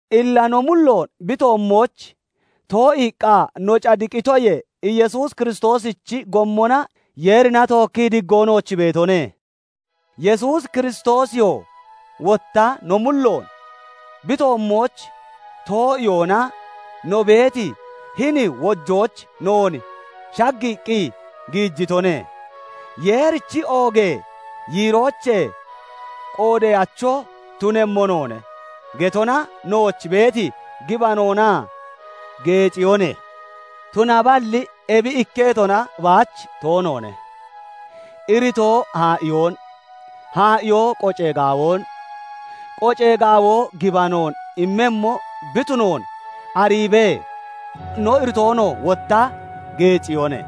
Illa no mulloon bi toommooch too'iiqqa no cadiqitoyee, Yesuus Kiristoosichi gommona Yeerina tookkii diggoo nooch beetone. Yesuus Kiristoosiyoo wotta no mulloon bi toommooch too'iyoona no beeti hini wojooch noon shaggiiqqi giijitone. "Yeerichi oogee yiiroochee qoodeyacho tunemmo noone" getona nooch beeti gibanoona geeciyone. Tunaballi ebi ikketona baach toonoone; iritoo haa'iyoon, haa'iyoo qocee gaawoon, qocee gaawoo gibanoon immemmo bi tunoon ariibee, no iritoonoo wotta geeciyone.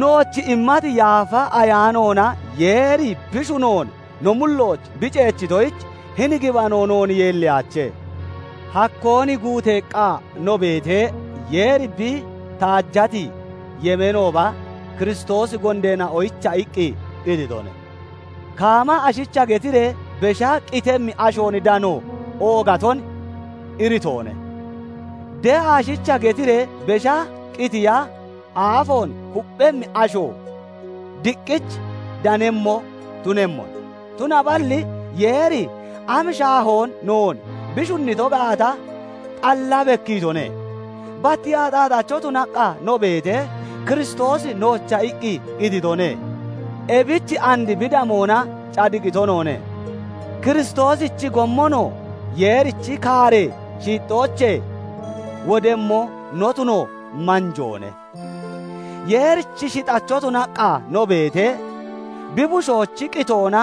Nooch immati Yaafa Ayaanoona Yeeri bi shunoon no mullooch bi ceechitoyich hini gibano noon yeelliyaache. Hakkoon guuteeqqa no beetee, Yeeri bi taajati yemeenooba Kiristoosi gondeena'oyicha iqqi qititone. Kaama ashicha getiree besha qitemmi ashoon dano oogaton iritoone; de'a ashicha getiree besha qitiya aafoon kupphemmi asho diqqich danemmo tunemmone. Tunaballi Yeeri am shaahoon noon bi shunnito gaata xalla bekkiitone; bat axaaxacho tunaqqa no beetee, Kiristoosi noocha iqqi qititone. Ebich and bi damoona cadiqito noone; Kiristoosichi gommonoo Yeerichi kaaree shiixxoochee wodemmo no tuno manjoone. Yeerichi shixacho tunaqqa no beetee, bi bushoochi qitoona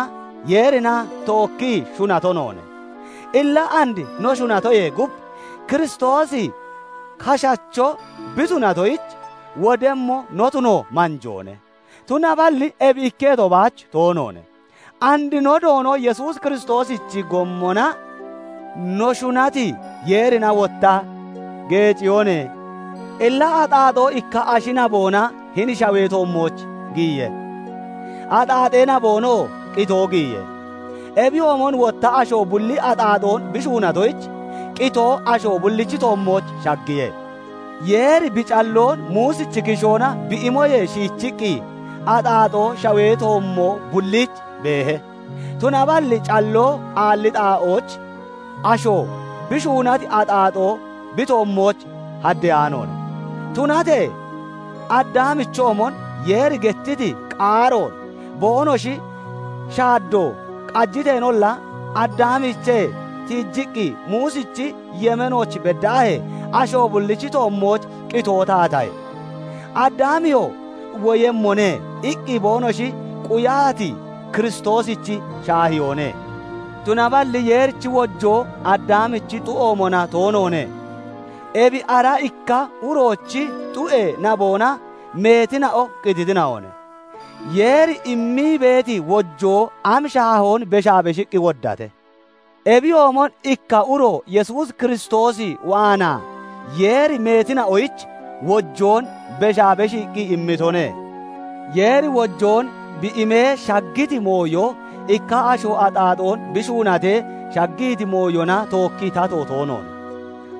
Yeerina tookkii shunato noone; illa and no shunatoyee gub, Kiristoosi kashacho bi tunatoyich, wodemmo no tuno manjoone. Tunaballi ebi ikketo baach toonoone; and no Doono Yesuus Kiristoosichi gommona no shunati Yeerina wotta geeciyone. Illa axaaxoo ikka ashi naboona hini shawee toommooch giyiye; axaaxee naboonoo qitoo giyiye; ebiyoomon wotta asho bulli axaaxoon bi shuunatoyich, qitoo asho bullichi toommooch shaggiye. Yeeri bi calloon Muusichi kishoona bi imoyee shiichiqqi, axaaxoo shawee toommo bulliich beehe; tunaballi calloo aalli xaa'ooch asho bi shuunati axaaxoo bi toommooch haddeyaanoone. Tunatee Addaamichoomon Yeeri gettiti qaaroon boonoshi shaaddo qajiteenolla, Addaamiichee tiijiqqi Muusichi yemeenooch beddaahee, asho bullichi toommooch qitoo taatahe. Addaamiyoo "Woyemmone" iqqi boonoshi quyati Kiristoosichi shaahiyoone. Tunaballi Yeerichi wojoo Addaamichi xu'oomona toonoone; ebi ara ikka uroochi xu'ee naboona meetina'o qititina'one; Yeeri immii beeti wojoo am shaahoon beshaa beshiqqi woddate! Ebiyoomon ikka uro Yesuus Kiristoos waanaa Yeeri meetina'oyich wojoon beshaa beshiiqqi immitone. Yeeri wojoon bi imee shaggiti mooyo ikka asho axaaxoon bi shuunatee shaggiti mooyona tookkii tato toonoone.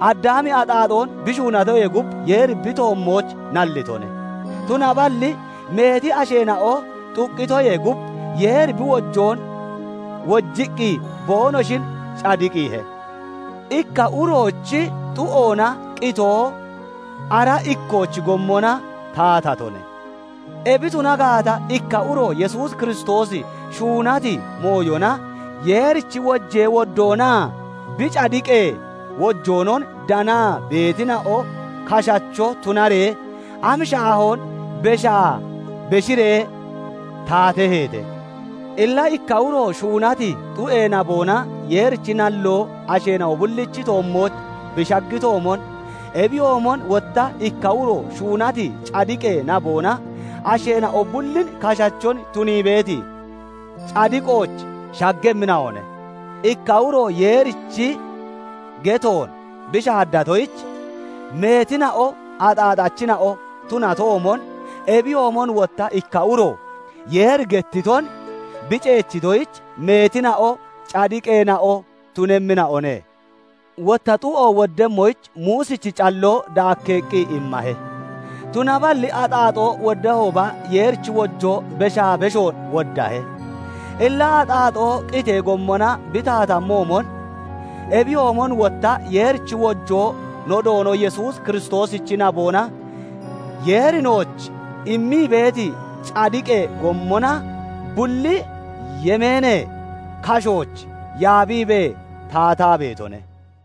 Addaami axaaxoon bi shuunatoyee gub, Yeeri bi toommooch nallitone; tunaballi meeti asheena'o xuqqitoyee gub, Yeeri bi wojoon wojiqqi boonoshin cadiqiihe. Ikka uroochi xu'oona qitoo ara ikkoochi gommona taatatone; ebi tuna gaata, ikka uro Yesuus Kiristoosi shuunati mooyona Yeerichi wojee woddoonaa bi cadiqee wojoonon danaa beetina'o kashacho tunaree am shaahoon beshaa beshiree taateheete! Illa ikka uro shuunati xu'ee naboona Yeerichi nalloo asheena'o bullichi toommooch bi shaggitoomon, ebiyoomon wotta ikka uro shuunati cadiqee naboona asheena'o bullin kashachon tunii beeti cadiqooch shaggemmina'one. Ikka uro Yeerichi getoon bi shaaddatoyich meetina'o axaaxachina'o tunatoomon, ebiyoomon wotta ikka uro Yeeri gettiton bi ceechitoyich meetina'o cadiqeena'o tunemmina'one. Wotta xu'o woddemmoyich Muusichi calloo daakkeeqqi immahe; tunaballi axaaxoo woddahooba, Yeerichi wojoo beshaa beshoon woddahe. Illa axaaxoo qitee gommona bi taatatoomon, ebiyoomon wotta Yeerichi wojoo no Doono Yesuus Kiristoosichi naboona Yeeri nooch immii beeti cadiqee gommona bulli yemeenee kashooch yaabiibee taataa beetone.